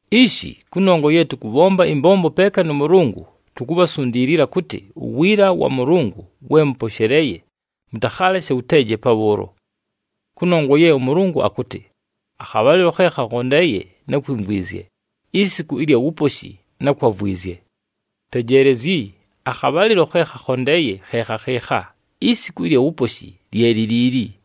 Ishi, kʉnongwa ye tʉkʉbhomba ɨmbombo peeka nʉ Mʉlʉngʉ, tukubhasundiilila kʉtɨ uwiila wa Mʉlʉngʉ we mʉposheleeye, mʉtakhaaleshe wʉteeje pabhʉʉlo. Kʉnongwa ye ʉMʉlʉngʉ akʉtɨ, “Akhabhalɨlo khe khakhondeeye, nákwimvwizye, isiku ɨlya wuposhi, nákwavwizye.” Tejeelezyi, akhabhalɨlo khe khakhondeeye khe khakhɨɨkha, isiku ɨlya wuposhi lye li liili!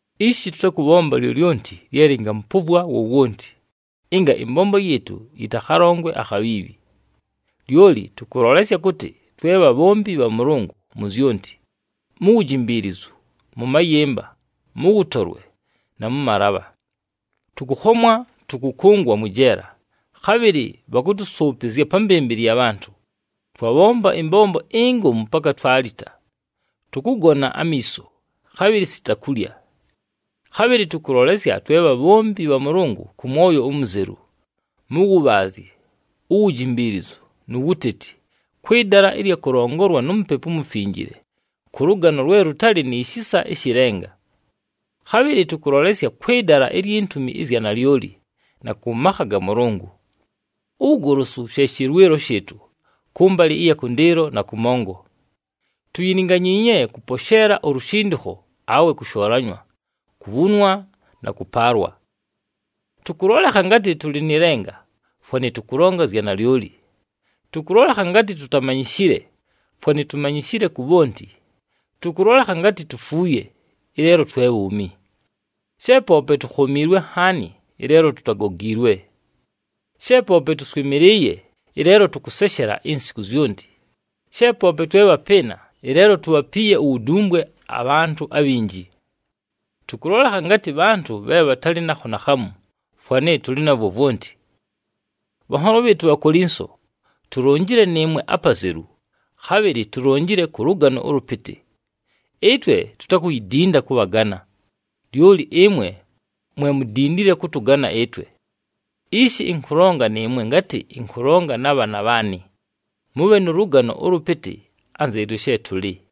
Ishi tʉtakʉbhomba lyolyonti lye lɨngamʉpʉvwa wowonti, ɨnga ɨmbombo yɨɨtʉ yɨtakhalongwe akhabhiibhi. Lyoli tʉkʉlolesya kʉtɨ twe bhabhombi bha Mʉlʉngʉ mu zyonti: mu wujimbiilizu, mʉ mayɨmba, mʉ wʉtolwe, na mʉ malabha. Tʉkʉkhomwa, tʉkʉkʉngwa mwɨ jeela, khabhɨlɨ bhakʉtʉsʉʉpɨzya pa mbɨmbɨlɨ ya bhantʉ, twabhomba ɨmbombo ingomu paka twalita, tʉkʉgona amiiso, khabhɨlɨ sita kulya. Khabhɨlɨ tʉkʉlolesya twe bhabhombi bha Mʉlʉngʉ kʉ mwoyo umuzelu, mʉ wʉbhaazye, uwujimbiilizu, nu wuteti, kwɨ dala ɨlya kʉlongolwa nu Mupepu uMufinjile, kʉ lʉgano lwe lʉtalɨ ni shisa ɨshɨ lenga. Khabhɨlɨ tʉkʉlolesya kwɨ dala ilyi ntumi ɨzya nalyoli, na kʉ makha ga Mʉlʉngʉ. Uwugolosu, she shɨlwɨlo shɨɨtʉ, kʉmbalɨ ɨya kʉndɨɨlo na kʉmongo. Tuyilinganyiinye kʉposheela ulushindikho, awe kʉshoolanywa, kubhunwa, na kʉpaalwa. Tʉkʉlolekha ngatɨ tʉlɨ nɨ lenga, fwanɨ tʉkʉlonga zya nalyoli. Tʉkʉlolekha ngatɨ tutamanyishile, fwanɨ tumanyishile ku bhonti, tʉkʉlolekha ngatɨ tufuuye, ɨleelo twe bhuumi. She poope tukhomiilwe nhaani ɨleelo tutagogiilwe. She poope tʉswɨmɨlɨɨye, ɨleelo tʉkʉseshela insiku zyonti, she poope twe bhapɨɨna, ɨleelo tubhapiiye uwudumbwe abhantʉ abhinji. Tʉkʉlolekha ngatɨ bhantʉ bhe bhatalɨ nakho naakhamu, fwanɨ tʉlɨ navwo vwonti. Bhanholo bhɨɨtʉ Bhakolinso, tulonjile nɨɨmwe apazelu, khabhɨlɨ tulonjile kʉ lʉgano ʉlʉpɨtɨ. Ɨtwe tutakuyidinda kʉbhagana, lyoli ɨmwe, mwe mudindile kʉtʉgana ɨtwe. Ishi ɨnkʉlonga nɨɨmwe ngatɨ ɨnkʉlonga na bhaana bhaanɨ: mʉbhe nʉ lʉgano ʉlʉpɨtɨ, anzɨɨtwe she tʉlɨ.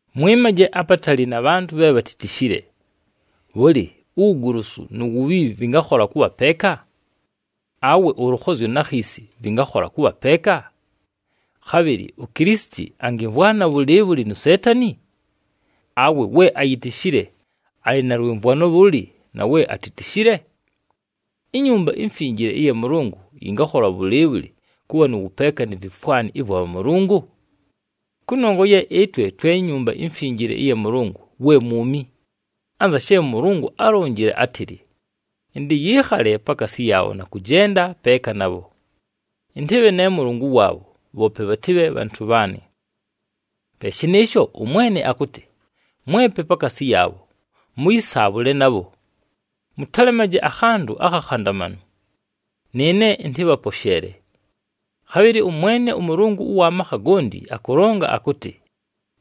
Mwɨmaje apatali na bhantʉ bhe bhatitishile. Bhʉlɨ, uwugolosu nu wubhiibhi vɨngakhola kʉbha peeka? Awe ʉlʉkhozyo na khiisi vɨngakhola kʉbha peeka? Khabhɨlɨ uKilisiti angimvwana bhʉlɨɨbhʉlɨ nu Seetani? Awe we ayitishile alɨ na lwɨmvwano bhʉlɨ na we atitishile? INyumba iMfinjile ɨya Mʉlʉngʉ yɨngakhola bhʉlɨɨbhʉlɨ kʉbha nʉ wʉpeeka ni vifwani ɨvwa bhamʉlʉngʉ? Kʉnongwa ye ɨtwe twe Nyumba iMfinjile ɨya Mʉlʉngʉ we mwumi! Anza she ʉMʉlʉngʉ álonjile átɨlɨ, “Ɨntɨyɨɨkhale pakaasi yaabho na kʉjenda peeka nabho. Ɨntɨbhe ne Mʉlʉngʉ waabho, bhoope bhatɨbhe bhantʉ bhaanɨ.” Pe shɨnɨɨsho ʉMwene akʉtɨ, “Mwepe pakaasi yaabho, mʉyɨsaabhʉle nabho! Mʉtalemaje akhantʉ akhakhandamanu! Nɨɨne ɨntɨbhaposheele.” Khabhɨlɨ ʉMwene ʉMʉlʉngʉ ʉwa makha gonti akʉlonga akʉtɨ,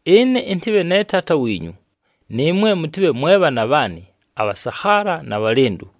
“Ɨne ɨntɨbhe ne Taata wiinyu, nɨɨmwe mʉtɨbhe mwe bhaana bhaanɨ abhasakhaala na bhalɨndʉ.”